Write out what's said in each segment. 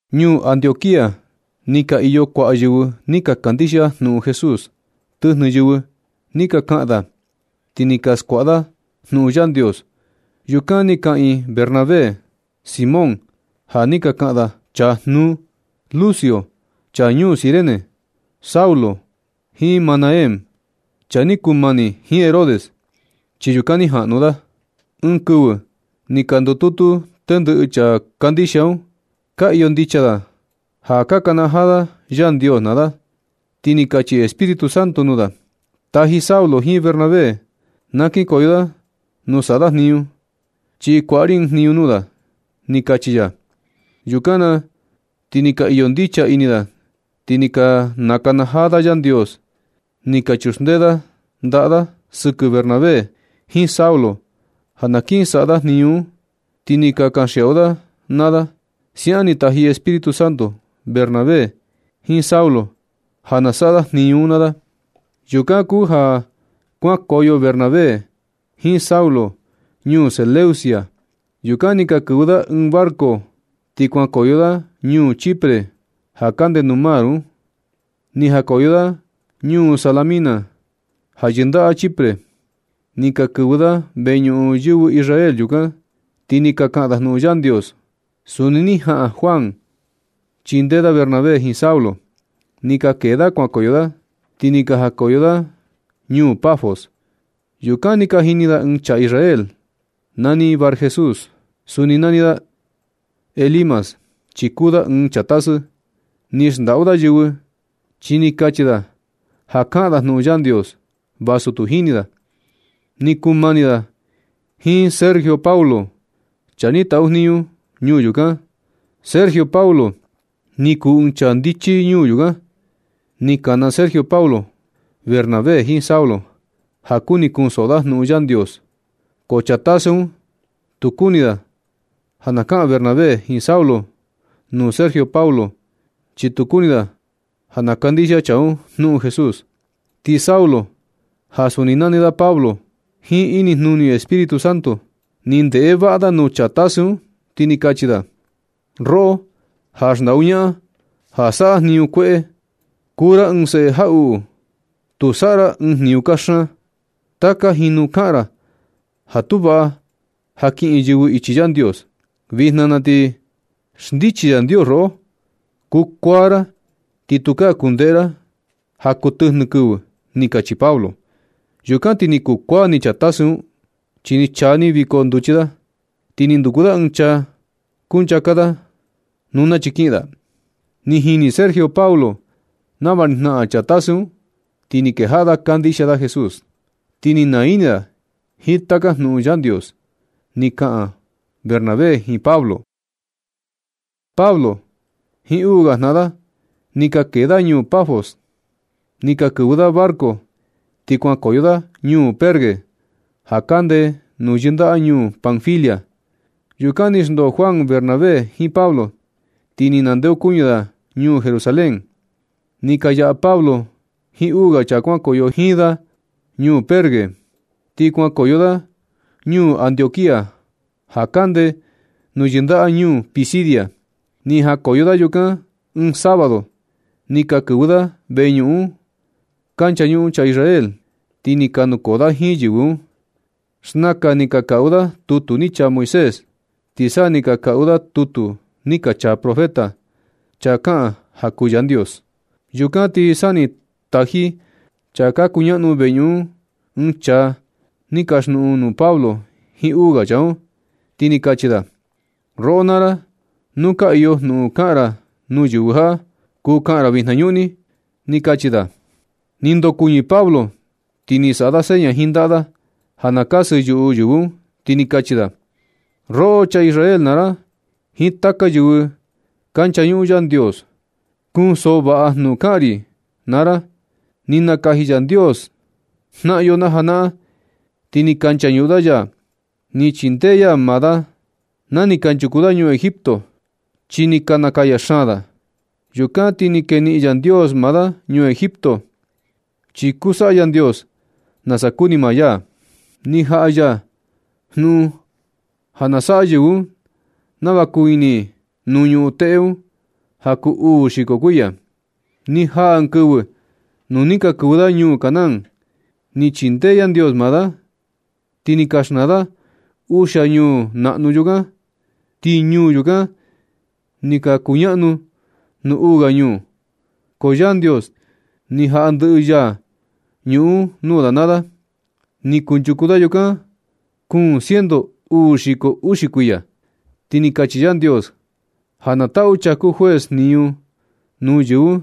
Ñuu Antioquía ni ka iyo kuaꞌa yɨvɨ ni ka kandixia jnuꞌun Jesús. Tɨjnɨ yɨvɨ ni ka kaꞌan da, ti ni ka skuaꞌa da jnuꞌun Yandios. Yukan ni kaꞌiin Bernabé, Simón ja ni ka kaꞌan da “Chaa jnuu”, Lucio chaa ñuu Cirene, Saulo, jiin Manaén chaa ni kuu mani jiin Herodes, chi yukan ni jaꞌnu da. Ɨɨn kɨvɨ ni ka ndututu tendɨꞌɨ chaa ka kandixia un, ka iyo ndicha da ja nakanajaa da Yandios naa da, ti ni kachi Espíritu Santo nuu da: ―Taji Saulo jiin Bernabé na kinkoyo da nuu saꞌa da jniñu, chi kuaꞌa ri ɨɨn jniñu nuu da ―ni kachi ya. Yukan na ti ni ka iyo ndicha ini da, ni ka nakanajaa da Yandios. Ni ka chuxndee da ndaꞌa da sɨkɨ Bernabé jiin Saulo ja na kiꞌin saꞌa da jniñu un, ti ni ka kanxiaꞌu da naa da. Siaꞌan ni taji Espíritu Santo Bernabé jiin Saulo ja na saꞌa da jniñu un naa da. Yukan kuu ja kuankoyo Bernabé jiin Saulo ñuu Seleucia. Yukan ni ka kɨvɨ da ɨɨn barco ti kuankoyo da ñuu Chipre, ja kande nuu mar un. Ni jakoyo da ñuu Salamina, ja yɨndaꞌa Chipre. Ni ka kɨvɨ da veñuꞌun yɨvɨ Israel yukan, ti ni ka kaꞌan da jnuꞌun Yandios. Suni ni jaꞌan Juan chindee da Bernabé jiin Saulo. Ni ka kee da kuankoyo da ti ni jakoyo da ñuu Pafos. Yukan ni ka jini da ɨɨn chaa Israel nani Barjesús. Suni nani da Elimas chi kuu da ɨɨn chaa tasɨ. Ni xndaꞌu da yɨvɨ, chi ni kachi da ja kaꞌan da jnuꞌun Yandios vasu tu jini da. Ni kuu mani da jiin Sergio Paulo, chaa ni taꞌu jniñu ñuu yukan. Sergio Paulo ni kuu ɨɨn chaa ndichi ñuu yukan. Ni kana Sergio Paulo Bernabé jiin Saulo ja kuni kunsoꞌo da jnuꞌun Yandios. Ko chaa tasɨ un tu kuni da ja na kaꞌan Bernabé jiin Saulo nuu Sergio Paulo, chi tu kuni da ja na kandixia chaa un jnuꞌun Jesús. Ti Saulo, ja suni nani da Pablo, jiin inijnuni Espíritu Santo ni ndeꞌe vaꞌa da nuu chaa tasɨ un, ti ni kachi da: ―Roꞌo ja xndaꞌu ñaꞌan, ja saꞌa jniñu kueꞌe. Kuu ra ɨɨn seꞌe jaꞌuꞌu. Tu saꞌa ra ɨɨn jniñu kaxan. Taka jinu kaꞌan ra ja tu vaꞌa ja kiꞌin yɨvɨ ichi Yandios. Vijna na ti xndichi Yandios roꞌo. Kukuaa ra ti tu kundeꞌe ra ja kuu tɨjnɨ kɨvɨ ―ni kachi Pablo. Yukan ti ni kukuaa ni chaa tasɨ un, chi ni chaa ni viko nduchi da, ti ni nduku da ɨɨn chaa kunchaka da nuu nachi kiꞌin da. Ni jini Sergio Paulo nava ni jnaꞌan chaa tasɨ un, ti ni kejaꞌa da kandixia da Jesús, ti ni naa ini da jiin taka jnuꞌun Yandios ni ka kaꞌan Bernabé jiin Pablo. Pablo jiin uu ga jnaꞌan da, ni ka kee da ñuu Pafos, ni ka kɨvɨ da barco ti kuankoyo da ñuu Perge, ja kande nuu yɨndaꞌa ñuu Panfilia. Yukan ni xndoo Juan Bernabé jiin Pablo, ti ni nandeokuñɨ da ñuu Jerusalén. Ni ka yaꞌa Pablo jiin uu ga chaa kuankoyo jiin da ñuu Perge, ti kuankoyo da ñuu Antioquía ja kande nuu yɨndaꞌa ñuu Pisidia. Ni jakoyo da yukan ɨɨn sábado, ni ka kɨvɨ da veñuꞌun nuu ka nchañuꞌun chaa Israel, ti ni ka nukoo da jiin yɨvɨ un. Xnakan ni ka kaꞌu da tutu ni chaa Moisés, ti sa ni ka kaꞌu da tutu ni ka chaa profeta, chaa kaꞌan ja kuu Yandios. Yukan ti sa ni ka taji chaa ka kuñaꞌnu veñuꞌun un ɨɨn chaa ni kaxjnuꞌun nuu Pablo jiin uu ga chaa un, ti ni kachi da: ―Roꞌo naa ra, nu ka iyo jnuꞌun kaꞌan ra nuu yɨvɨ jaꞌa, kuu kaꞌan ra vijnañuꞌni ―ni kachi da. Ni ndokuɨñɨ Pablo, ti ni saꞌa da seña jiin ndaꞌa da ja na kasɨ yuꞌu yɨvɨ un, ti ni kachi da: ―Roꞌo chaa Israel naa ra jiin taka yɨvɨ ka nchañuꞌun Yandios, kunsoꞌo vaꞌa ra jnuꞌun kaꞌan ri naa ra. Ni nakaji Yandios jnaꞌan yo najanaꞌan, ti ni ka nchañuꞌun da ya. Ni chindee ya maa da na ni kanchuku da ñuu Egipto, chi ni ka nakaya xaan da. Yukan ti ni keniꞌin Yandios maa da ñuu Egipto, chi kuu saꞌa Yandios nasa kuni maa ya. Ni jaꞌa ya jnuꞌun ja na saꞌa yɨvɨ un nava kuu ini i nuu ñuꞌun teꞌe un ja kuu uu xiko kuiya. Ni jaa ɨɨn kɨvɨ nu ni ka kɨvɨ da ñuu Canaán. Ni chindee Yandios maa da, ti ni ka xnaa da uxia ñuu naꞌnu yukan. Ti ñuu yukan ni ka kuñaꞌnu nuu uu ga ñuu, ko Yandios ni jaꞌa ndɨꞌɨ ya ñuꞌun un nuu da naa da. Ni kunchuku da yukan kuun ciento uu xiko uxi kuiya, ti ni kachi Yandios ja na taꞌu chaa kuu juez jniñu nuu yɨvɨ un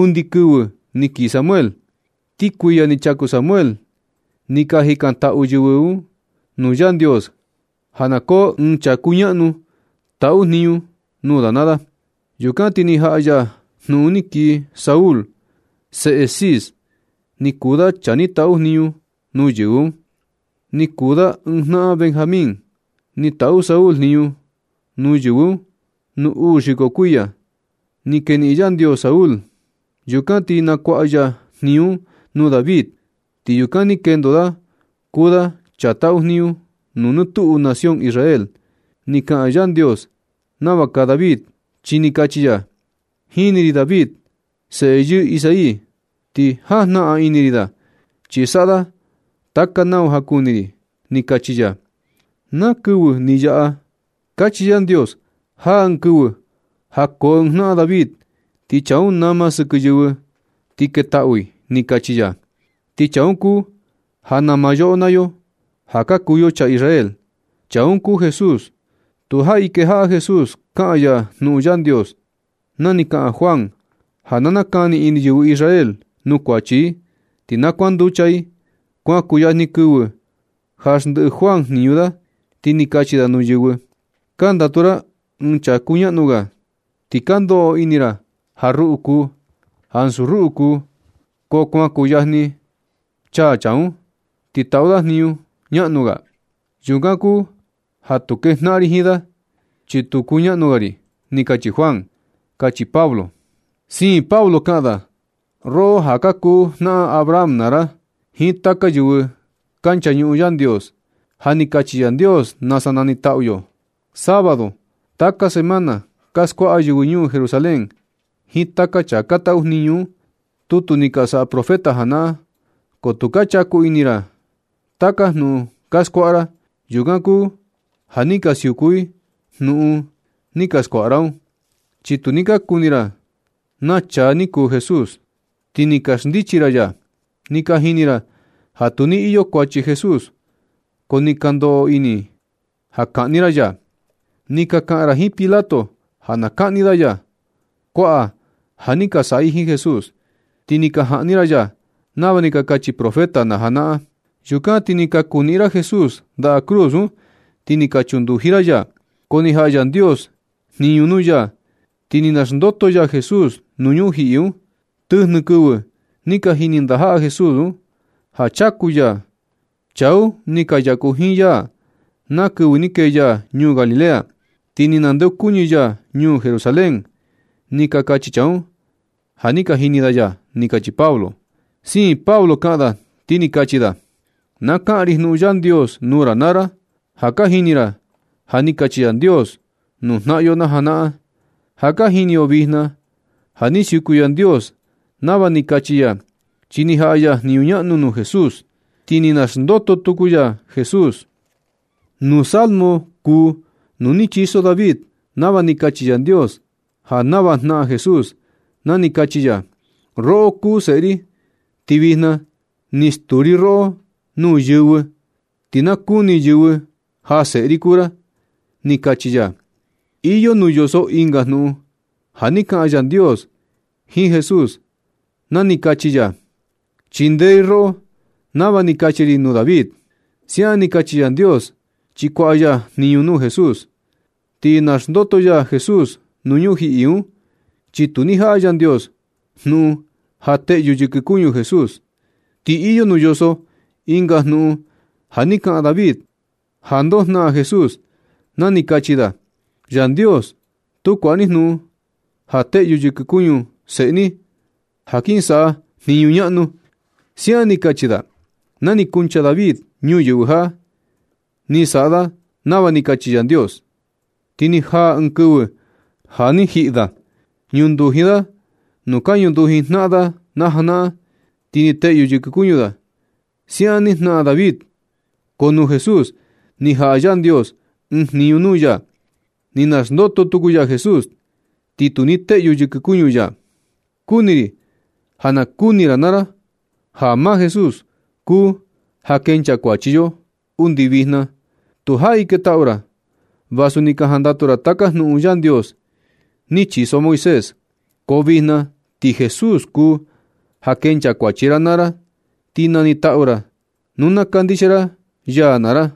undi kɨvɨ ni kii Samuel. Nɨ kuiya ni chaku Samuel, ni ka jikantaꞌu yɨvɨ un nuu Yandios ja na koo ɨɨn chaa kañaꞌnu taꞌu jniñu nuu da naa da. Yukan ti ni jaꞌa ya jnuꞌun ni kii Saúl, seꞌe Cis, ni kuu da chaa ni taꞌu jniñu nuu yɨvɨ un. Ni kuu da ɨɨn jnaꞌan Benjamín. Ni taꞌu Saúl jniñu nuu yɨvɨ un nuu uu xiko kuiya. Ni keniꞌin Yandios Saúl. Yukan ni nakuaꞌa ya jniñu un nuu David, ti yukan ni kendo da kuu da chaa taꞌu jniñu nɨ tuꞌu nación Israel. Ni kaꞌan Yandios nava kaa David, chi ni kachi ya: “Jini ri David, seꞌe yɨɨ Isaí, ti jajnaꞌan ini ri da, chi saꞌa da taka nau ja kuni ri”, ni kachi ya. Na kɨvɨ ni yaꞌa ni kachi Yandios: “Jaa ɨɨn kɨvɨ ja koo ɨɨn jnaꞌan David, ti chaa un nama sɨkɨ yɨvɨ ti ketaꞌu i”, ni kachi ya. Ti chaa un kuu ja nama yoꞌo naa yo ja ka kuu yo chaa Israel. Chaa un kuu Jesús. Tu jaꞌi kejaꞌa Jesús kaꞌan ya jnuꞌun Yandios na ni kaꞌan Juan ja na nakani ini yɨvɨ Israel nuu kuachi i, ti na kuanducha i. Kuan kuyajni kɨvɨ ja xndiꞌi Juan jniñu da, ti ni kachi da nuu yɨvɨ: “Ka ndatu ra ɨɨn chaa kuñaꞌnu ga, ti ka ndoꞌo ini ra ja ruꞌu kuu, ansu ruꞌu kuu, ko kuan kuyajni chaa chaa un, ti taꞌu da jniñu ñaꞌnu ga. Yukan kuu ja tu kejnaꞌan ri jiin da, chi tu kuñaꞌnu ga ri”, ni kachi Juan ―kachi Pablo. Siin Pablo kaꞌan da: ―Roꞌo ja ka kuu jnaꞌan Abraham naa ra, jiin taka yɨvɨ ka nchañuꞌun Yandios, ja ni kachi Yandios nasa nanitaꞌu yo. Sábado taka semana, ka skuaꞌa yɨvɨ ñuu Jerusalén jiin taka chaa ka taꞌu jniñu un, tutu ni ka saꞌa profeta janaꞌan, ko tu ka chaku ini ra taka jnuꞌun ka skuaꞌa ra. Yukan kuu ja ni ka siuku i jnuꞌun ni ka skuaꞌa ra un, chi tu ni ka nakuni ra na chaa ni kuu Jesús, ti ni ka xndichi ra ya. Ni ka jini ra ja tu ni iyo kuachi Jesús, ko ni ka ndoꞌo ini i ja kaꞌni ra ya. Ni ka kaꞌan ra jiin Pilato ja na kaꞌni da ya. Kuaꞌa ja ni ka saꞌa i jiin Jesús, ti ni ka jaꞌni ra ya nava ni ka kachi profeta najanaꞌan. Yukan ti ni ka kuniꞌin ra Jesús ndaꞌa cruz un, ti ni ka chunduji ra ya. Ko ni jaꞌa Yandios jniñu nuu ya ti ni naxndoto ya Jesús nuu ñujiꞌi un. Tɨjnɨ kɨvɨ ni ka jini ndajaꞌa Jesús un ja chaku ya. Chaa un ni ka yaku jiin ya na kɨvɨ ni kee ya ñuu Galilea, ti ni nandeokuñɨ ya ñuu Jerusalén. Ni ka kachi chaa un ja ni ka jini da ya ―ni kachi Pablo. Siin Pablo kaꞌan da, ti ni kachi da: ―Ka kaꞌan ri jnuꞌun Yandios nuu ra naa ra. Ja ka jini ra ja ni kachi Yandios nuu jnaꞌan yo najanaꞌan. Ja ka jini yo vijna ja ni siuku Yandios nava ni kachi ya, chi ni jaꞌa ya jniñu ñaꞌnu nuu Jesús, ti ni naxndoto tuku ya Jesús. Nuu Salmo kuu uu ni chiso David nava ni kachi Yandios ja nava jnaꞌan Jesús na ni kachi ya: “Roꞌo kuu seꞌe ri, ti vijna ni stuu ri roꞌo nuu yɨvɨ, ti na kuni yɨvɨ ja seꞌe ri kuu ra”, ni kachi ya. Iyo nuu yoso ɨnga jnuꞌun ja ni kaꞌan Yandios jiin Jesús na ni kachi ya: “Chindee ri roꞌo nava ni kachi ri nuu David.” Siaꞌan ni kachi Yandios, chi kuaꞌa ya jniñu nuu Jesús ti naxndoto ya Jesús nuu ñujiꞌi un, chi tu ni jaꞌa Yandios jnuꞌun ja teꞌyu yɨkɨ kuñu Jesús. Ti iyo nuu yoso ɨnga jnuꞌun ja ni kaꞌan David ja ndoo na jnaꞌan Jesús na ni kachi da: “Yandios, tu kuaꞌa ni jnuꞌun ja teꞌyu yɨkɨ kuñu seꞌe ni, ja kin saꞌa jniñu ñaꞌnu”, siaꞌan ni kachi da. Na ni kuncha David ñuyɨvɨ jaꞌa, ni saꞌa da nava ni kachi Yandios, ti ni jaa ɨɨn kɨvɨ ja ni jiꞌi da. Ñunduji da nuu ka ñunduji jnaꞌan da najanaꞌan, ti ni teꞌyu yɨkɨ kuñu da. Siaꞌan ni jnaꞌan David, ko nuu Jesús ni jaꞌa Yandios ɨɨn jniñu nuu ya, ni naxndoto tuku ya Jesús, ti tu ni teꞌyu yɨkɨ kuñu ya. Kuni ri ja na kuni ra naa ra ja maa Jesús kuu ja kenchaa kuachi yo. Undi vijna tu jaꞌi ketaꞌu ra vasu ni ka jandatu ra taka jnuꞌun Yandios ni chiso Moisés. Ko vijna ti Jesús kuu ja kenchaa kuachi ra naa ra, ti nanitaꞌu ra nu na kandixia ra ya naa ra.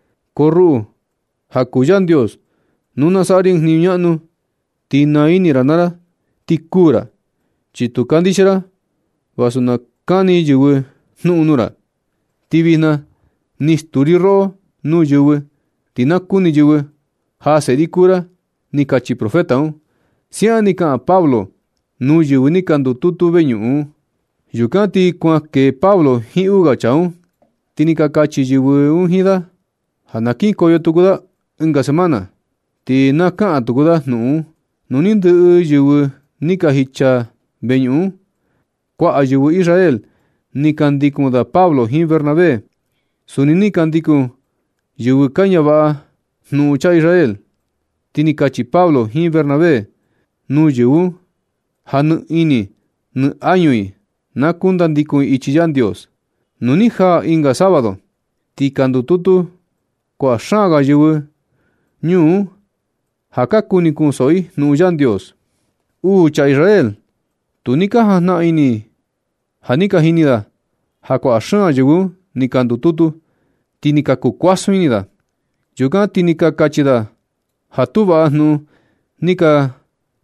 Ko ruꞌu ja kuu Yandios, nu na saꞌa ri ɨɨn jniñu ñaꞌnu, ti naa ini ra naa ra ti kuū ra. Chi ni tu kandixia ra vasu na kani yɨvɨ jnuꞌun nuu ra. Ti vijna ni stuu ri roꞌo nuu yɨvɨ, ti na kuni yɨvɨ ja seꞌe ri kuu ra, ni kachi profeta un. Siaꞌan ni kaꞌan Pablo nuu yɨvɨ ni ka ndututu veñuꞌun un. Yukan ti nu kuan kee Pablo jiin uu ga chaa un, ti ni ka kachi yɨvɨ un jiin da ja na kinkoyo tuku da ɨnga semana, ti na kaꞌan tuku da jnuꞌun un. Nu ni ndɨꞌɨ yɨvɨ ni ka jicha veñuꞌun un, kuaꞌa yɨvɨ Israel ni ka ndikun da Pablo jiin Bernabé. Suni ni ka ndikun yɨvɨ ka ñavaꞌa jnuꞌun chaa Israel. Ti ni kachi Pablo jiin Bernabé nuu yɨvɨ un ja nɨ ini nɨ añu i na kundikun i ichi Yandios. Nu ni jaa ɨnga sábado, ti ni ka ndututu kuaꞌa xaan ga yɨvɨ ñuu un ja ka kuni i kunsoꞌo i jnuꞌun Yandios. Uu chaa Israel, tu ni ka jajnaꞌan ini ja ni ka jini da ja kuaꞌa xaan yɨvɨ un ni ka ndututu, ti ni ka kuu kuasun ini da. Yukan ti ni ka kachi da ja tu vaꞌa jnuꞌun ni ka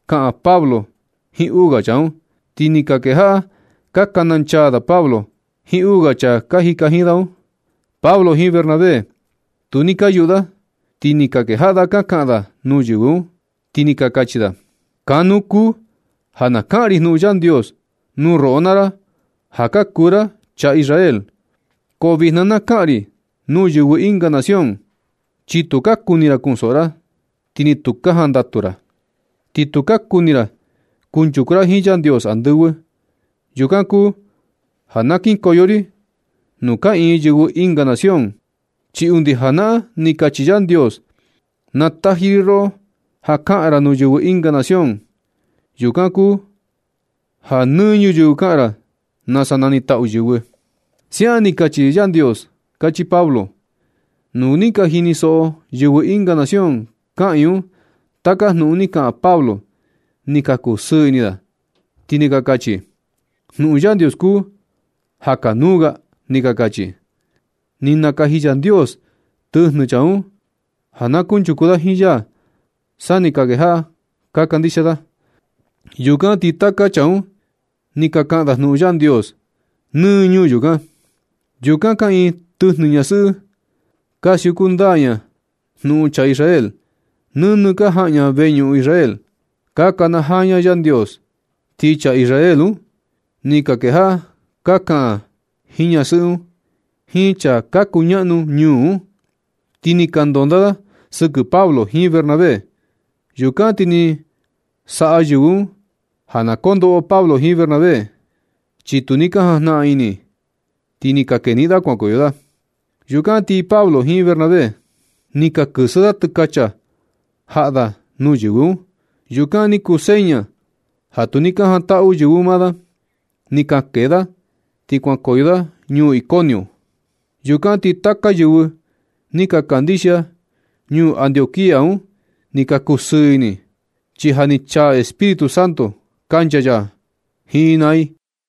kaꞌan Pablo jiin uu ga chaa un, ti ni ka kejaꞌa ka kananchaa da Pablo jiin uu ga chaa ka jika jiin da un. Pablo jiin Bernabé, tu ni ka yuꞌu da, ti ni ka kejaꞌa da ka kaꞌan da nuu yɨvɨ un, ti ni ka kachi da: ―Kanu kuu ja kaꞌan ri jnuꞌun Yandios nuu roꞌo naa ra ja ka kuu ra chaa Israel, ko vijna, na kaꞌan ri nuu yɨvɨ ɨnga nación, chi tu ka kuni ra kunsoꞌo ra, ti ni tu ka jandatu ra. Ti tu ka kuni ra kunchuku ra jiin Yandios andɨvɨ. Yukan kuu ja na kinkoyo ri nuu kaꞌiin yɨvɨ ɨnga nación, chi undi janaꞌan ni kachi Yandios: Ni taji ri roꞌo ja kaꞌan ra nuu yɨvɨ ɨnga nación. Yukan kuu ja nɨ ñuyɨvɨ kaꞌan ra nasa nanitaꞌu yɨvɨ. Siaꞌan ni kachi Yandios ―kachi Pablo. Nu ni ka jinisoꞌo yɨvɨ ɨnga nación kaꞌiin un taka jnuꞌun ni kaꞌan Pablo, ni ka kusɨɨ ini ti ni ka kachi: ―Jnuꞌun Yandios kuu ja kanuu ga ―ni ka kachi. Ni nakaji Yandios tɨjnɨ chaa un ja na kunchuku da jiin ya sa ni ka kejaꞌa ka kandixia da. Yukan ti taka chaa un ni ka kaꞌan da jnuꞌun Yandios nɨ ñuu yukan. Yukan kaꞌiin tɨjnɨ ñasɨꞌɨ ka siuku ndaa jnuꞌun chaa Israel. Nɨnɨ ka jaꞌan ña veñuꞌun Israel, ka kanajaa ña Yandios. Ti chaa Israel un ni ka kejaꞌa ka kaꞌan jiin ñasɨꞌɨ un, jiin chaa ka kuñaꞌnu ñuu un, ti ni ka ndondaa da sɨkɨ Pablo jiin Bernabé. Yukan ti ni saꞌa yɨvɨ un ja na kondoꞌo Pablo jiin Bernabé, chi tu ni ka jajnaꞌan ini, ti ni ka keniꞌin da kuankoyo da. Yukan ti Pablo jiin Bernabé, ni ka kɨsɨ da tɨkacha jaꞌa da nuu yɨvɨ un. Yukan ni kuu seña ja tu ni ka jantaꞌu yɨvɨ un maa da. Ni ka kee da ti kuankoyo da ñuu Iconio. Yukan ti taka yɨvɨ ni ka kandixia ñuu Antioquía un ni ka kusɨɨ ini i, chi ja ni chaa Espíritu Santo kancha ya jiin i naa i.